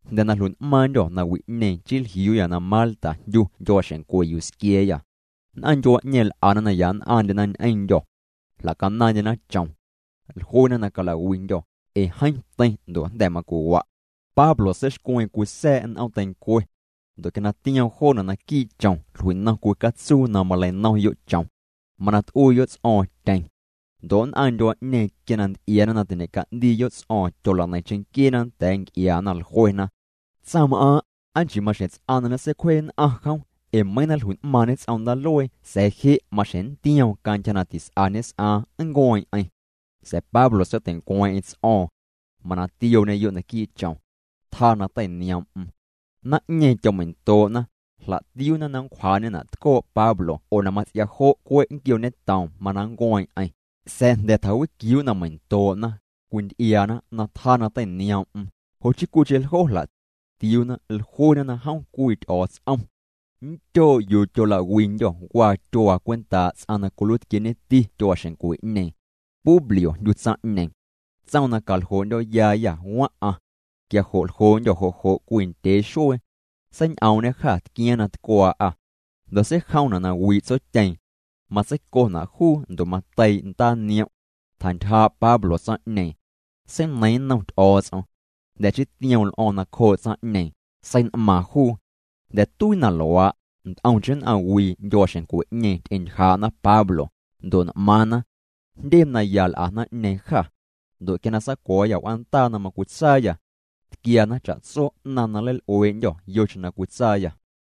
Jnda̱ na jlui'n'maaⁿndyô̱ nawi'ñeeⁿ chii jliuuyâ na Malta jndyu ndyuaaxeⁿncwe yuu squia̱a̱yâ. Nn'aⁿ ndyuaa'ñeeⁿ l'ana na ya nn'aⁿndyena ñ'eⁿndyô̱. Jla'canaaⁿndyena chom. Jluena na calawiindyô̱, ee jeeⁿ teiⁿ ndo' jnda̱ macwiwa'. Pablo seixcweeⁿ cwii sa̱a̱' n'oom teincwe. Ndo' quia na tioom joona' naquii' chom jlui'nom cwii catsuu na maleinomyo' chom. Mana t'uiiyo' ts'o̱o̱ⁿ tyeⁿ. Ndo' nn'aⁿ ndyuaa'ñeeⁿ quia na nty'iaana na tiñe'ca'ndiiyo' ts'o̱o̱ⁿ tyola'neiⁿ cheⁿnquieena nda̱a̱ nc'iaana. Jluena: —Tsaⁿm'aaⁿ' ¿aa nchii maxjeⁿ ts'aⁿ na ñeseicwjee nn'aⁿ jom? Ee meiiⁿ na jlui'n'maaⁿñê ts'om ndaaluee sa̱a̱ je' maxjeⁿ nntioom cantyja na tis'a ñes'aaⁿ nncueeⁿ'eⁿ. Sa̱a̱ Pablo seitei'ncweeⁿ'eⁿ ts'o̱o̱ⁿ. Mana tiooñeyo' naquii' chom. Tjaa na teinioom'm. Naⁿ'ñeeⁿ tyomeindoo'na, jla'tiuuna na nncwjaa'ñena' tcoo' Pablo oo na mats'ia jo' cwe' nnquiooñetoom mana nncueeⁿ'eⁿ. Sa̱a̱ jnda̱ tjawiquiuu' na meindoo'na, cwinty'iaana na tjaa na teinioom'm, jo' chii cwiicheⁿ ljo jla'tiuuna. Jluena na jom cwii ty'o̱o̱ts'om. Nndyoo' yuu tyolawindyô̱ waa tyuaa cwentaa' ts'aⁿ na cwiluiitquieeñeti tyuaaxeⁿncwe'ñeeⁿ. Publio jndyu tsaⁿ'ñeeⁿ. Tsoom na caljoo'ndyo̱yaayâ waⁿ'aⁿ. Quia jo' ljoo'ndyô̱ jo' jo' cwii ndyee xuee. Seiñ'oom'ñê jâ tquiaaⁿ na tcwaa'â. Ndo' seijomna' na wii' tsotyeeⁿ. Matseicona' juu ndo' mateii' ndaaniom'. Tjantyjaa' Pablo tsaⁿ'ñeeⁿ. Seineiiⁿ nnom Ty'o̱o̱ts'om. Jnda̱ chii tioom l'o̱o̱ⁿ nacjoo' tsaⁿ'ñeeⁿ, sein'maaⁿ juu. Jnda̱ tuii na luaa', nt'omcheⁿ nn'aⁿwii ndyuaaxeⁿncwe'ñeeⁿ ty'entyjaa'na Pablo, ndo' n'maaⁿna. Jndye naya l'a naⁿ'ñeeⁿ jâ. Ndo' quia na saacuo̱o̱yâ w'aandaa na macwitsaayâ, tquiana cha'tso 'naⁿ na nleil'uee'ndyô̱ yocheⁿ na cwitsaayâ.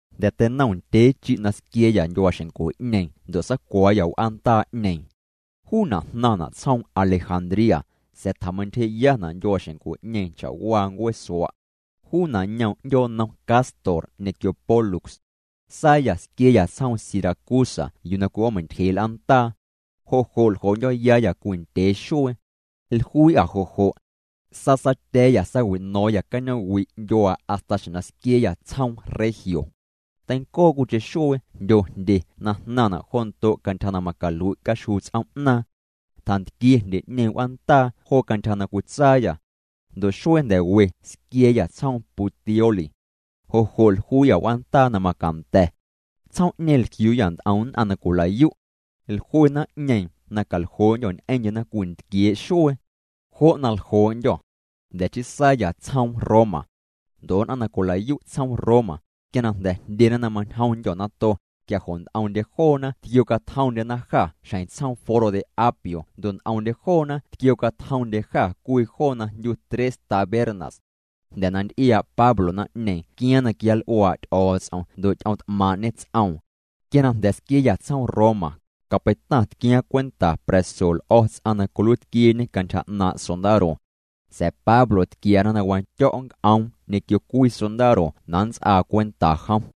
Jnda̱ teinom ndyee chi' na squia̱a̱yâ ndyuaaxeⁿncwe'ñeeⁿ ndo' saacuo̱o̱yâ w'aandaa'ñeeⁿ. Juuna' jnaⁿna' tsjoom Alejandría, sa̱a̱ tjameintyjee'yana' ndyuaaxeⁿncwe'ñeeⁿ cha'waa ncueesua'. Juuna' ñoom 'ndyoonnom Cástor ñequio Pólux. Saayâ squia̱a̱yâ tsjoom Siracusa yuu na cwi'oomeintyjee' l'aandaa. Jo' jo' ljoo'ndyo̱yaayâ cwii ndyee xuee. Jluii'â jo' jo'. Saasaatya̱a̱yâ saawi'no̱o̱ⁿyâ cañoom'wi' ndyuaa hasta xjeⁿ na squia̱a̱yâ tsjoom Regio. Teincoo cwiicheⁿ xuee jndyo jndye na jnaⁿna' jo ndo' cantyja na macalui' caxjuu ts'oom'naaⁿ. Tjantquie jndye'ñeeⁿ w'aandaa jo cantyja na cwitsaayâ. Ndo' xuee jnda̱ we squia̱a̱yâ tsjoom Puteoli. Jo' jo' jluii'â w'aandaa na macanda̱. Tsjoom'ñeeⁿ jliuuyâ nt'om nn'aⁿ na cwila'yu'. Jlue naⁿ'ñeeⁿ na caljoo'ndyô̱ ñ'eⁿndyena cwii ntquiee' xuee. Jo' na ljoo'ndyô̱. Jnda̱ chii saayâ tsjoom Roma. Ndo' nn'aⁿ na cwila'yu' tsjoom Roma, quia na jndyena na mañjomndyô̱ nato, quia jo' nt'omndye joona tquiocatjomndyena jâ xjeⁿ tsjoom Foro de Apio ndo' nt'omndye joona tquiocatjomndye jâ cwii joo na jndyu Tres Tabernas. Jnda̱ na nty'iaa' Pablo naⁿ'ñeeⁿ tquiaaⁿ na quianl'uaa' Ty'o̱o̱ts'om ndo' ty'oomt'maaⁿ'ñê ts'oom. Quia na jnda̱ squia̱a̱yâ tsjoom Roma, capeitaⁿ tquiaaⁿ cwenta pra̱so l'o̱ ts'aⁿ na cwiluiitquieñe cantyja 'naaⁿ sondaro. Sa̱a̱ Pablo tquiana na wandyo̱' nnc'oom ñequio cwii sondaro na nnts'aa cwenta jom.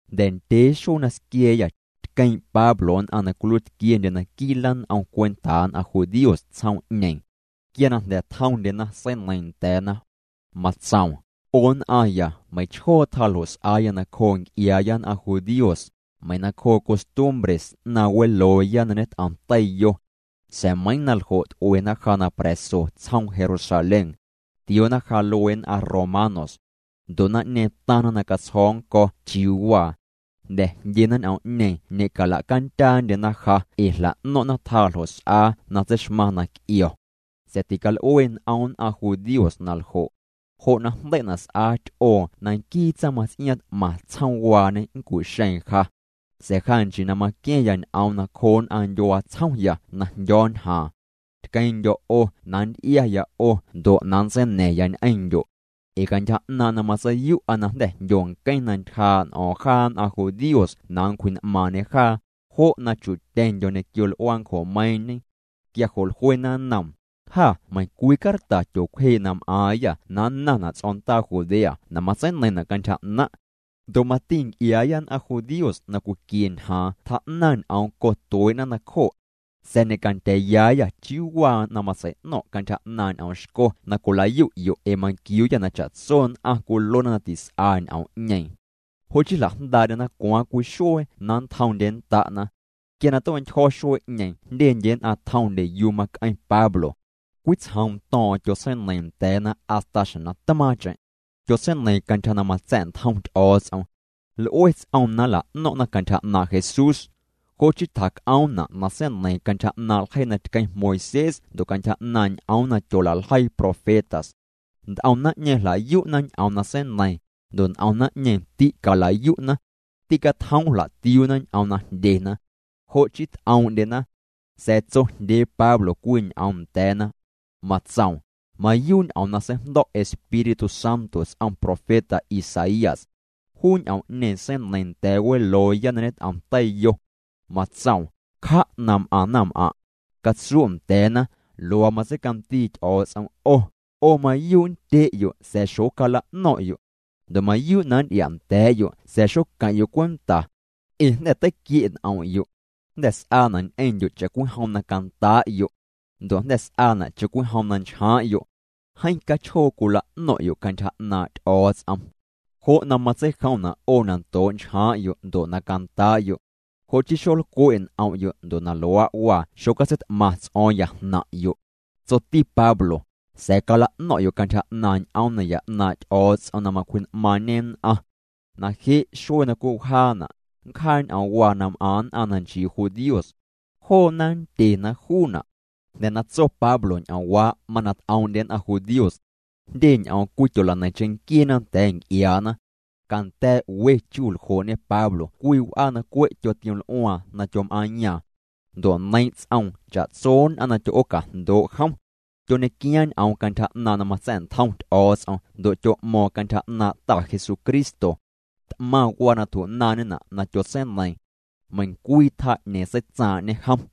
Jnda̱ ndyee xuee na squia̱a̱yâ, tqueeⁿ' Pablo nn'aⁿ na cwiluiitquiendye naquii' lan'om cwentaa nn'aⁿ judíos tsjoom'ñeeⁿ. Quia na jnda̱ tjomndyena seineiiⁿ nda̱a̱na. Matsoom: —'O nn'aⁿya meiⁿchjoo tjaa ljo' s'aaya nacjoo nc'iaaya nn'aⁿ judíos, meiⁿ nacjoo' costumbre 'naaⁿ welooya na ñet'om teiyo. Sa̱a̱ meiiⁿ na ljo' t'uena ja na pra̱so tsjoom Jerusalén. Tioona ja luee nn'aⁿ romanos. Ndo' naⁿ'ñeeⁿ taⁿna na catsjo̱o̱ nnco̱ chiuu waa. Jnda̱ jndyena ñ'oom'ñeeⁿ ñe'cala'candyaandyena ja ee jla'no̱ⁿ'na tjaa ljo' s'aa na tseixmaⁿ na c'io̱. Sa̱a̱ tical'ue n'om nn'aⁿ judíos na ljo'. Jo' na jndei'na' s'aa ty'oo na nquii tsaⁿmaⁿts'iaaⁿ t'maⁿ tsjoomwaañe nncu'xeeⁿ ja. Sa̱a̱ ja nchii na maqua̱ⁿya ñ'oom nacjoo nn'aⁿ ndyuaa tsjomya na jndyo̱o̱ ñjaaⁿ. Tqueeⁿ'ndyo̱ 'o na nnty'iaya 'o ndo' na nntseina̱ⁿya ñ'eⁿndyo'. Ee cantyja 'naaⁿ' na matseiyu'a na jnda̱ jndyo nqueⁿ na ntyjaa' n'o̱o̱ⁿ jaa nn'aⁿ judíos na nncwji'n'maaⁿñe jaa, jo' na chu'tyeⁿndyo̱ ñequio l'uaancjomeiiⁿñe. Quia jo' jluena nnoom: —Jâ meiⁿcwii carta tyoocwjee' na m'aaⁿyâ na nnaⁿna' ts'o̱ndaa Judea na matseineiⁿna' cantyja 'naⁿ'. Ndo' mati nc'iaaya nn'aⁿ judíos na cwiquie ñjaaⁿ tjaa'naⁿ ñ'oom cotuee'na nacjo'. Sa̱a̱ ñe'candya̱a̱yaayâ chiuu waa na matsei'no̱ⁿ' cantyja 'naaⁿ' ñ'oom xco na cwilayu'yo' ee manquiuuyâ na cha'tso nn'aⁿ cwiluena na tis'a ñ'oom'ñeeⁿ. Jo' chii jla'jndaa'ndyena cwaaⁿ cwii xuee na nntjomndyennda'na. Quia na tue'ntyjo̱ xuee'ñeeⁿ jndyendye nn'aⁿ tjomndye yuu mac'eⁿ Pablo. Cwitsjoom to̱o̱ⁿ'o̱ⁿ tyotseineiiⁿ nda̱a̱na hasta xjeⁿ na tmaaⁿcheⁿ. Tyotseineiiⁿ cantyja na matsa̱'ntjom Ty'o̱o̱ts'om. L'ue ts'oom na nla'no̱ⁿ'na cantyja 'naaⁿ' Jesús. Jo' chii tjac'oomna' na seineiiⁿ cantyja 'naaⁿ' ljeii na tqueⁿ Moisés ndo' cantyja 'naaⁿ' ñ'oom na tyola'ljeii profetas. Nt'om naⁿ'ñeeⁿ jla'yu'na ñ'oom na seineiiⁿ, ndo' nt'om naⁿ'ñeeⁿ tîcala'yu'na. Ticatjoom' jla'tiuuna ñ'oom na jndyena. Jo' chii t'oom'ndyena. Sa̱a̱ tsojndyee Pablo cwii ñ'oom nda̱a̱na. Matsoom: —Mayuu' ñ'oom na seijndo̱' Espíritu Santo ts'om profeta Isaías. Juu ñ'oom'ñeeⁿ seineiiⁿ nda̱a̱ welooya na ñet'om teiyo. Matsoom: Cja' na m'aⁿ naⁿm'aⁿ'. Catsu' nda̱a̱na: Luaa matseicandii Ty'o̱o̱ts'om 'o: 'O mayuu' nndye'yo' sa̱a̱ xocala'no̱ⁿ'yo'. Ndo' mayuu' na nnty'ia'nda̱a̱'yo' sa̱a̱ xoqueⁿ'yo' cwenta. Ee jnda̱ teiquie' n'om'yo'. Jnda̱ s'aana' ñ'eⁿndyo' cha'cwijom na candaa'yo'. Ndo' jnda̱ s'aana' cha'cwijom na nchjaaⁿ'yo'. Jeeⁿ cachjoo cwila'no̱ⁿ'yo' cantyja 'naaⁿ' Ty'o̱o̱ts'om. Jo' na matseijomna' 'o na ndoo' nchjaaⁿ'yo' ndo' na candaa'yo'. Jo' chii xolcwe' n'om'yo' ndo' na luaa' waa xocatseit'maⁿ ts'o̱o̱ⁿya jnaⁿ'yo'. Tsoti Pablo: —Sa̱a̱ cala'no̱ⁿ'yo' cantyja 'naaⁿ' ñ'oom naya 'naaⁿ' Ty'o̱o̱ts'om na macwji'n'maaⁿñê nn'aⁿ. Na je' xuee na cwii wjaana', nncjaa ñ'oomwaa na m'aⁿ nn'aⁿ na nchii judíos. Joona nndyena juuna'. Jnda̱ na tso Pablo ñ'oomwaa' mana t'oom'ndye nn'aⁿ judíos. Jndye ñ'oom cwityola'neiⁿ cheⁿnquieena nda̱a̱ nc'iaana. Canda̱a̱' we chu ljoo'ñe Pablo cwii w'aa na cwe' tyotioml'uaaⁿ na tyom'aaⁿyaaⁿ. Ndo' neiiⁿ' ts'oom cha'tso nn'aⁿ na tyo'oocajndoo' jom. Tyoñequiaaⁿ ñ'oom cantyja 'naaⁿ' na matsa̱'ntjom Ty'o̱o̱ts'om ndo' tyo'mo̱o̱ⁿ cantyja 'naaⁿ' Ta Jesucristo. T'maⁿ waa na tju'naaⁿñena' na tyotseineiiⁿ. Meiⁿcwii tjaa 'ñeeⁿ seitsaaⁿ'ñe jom.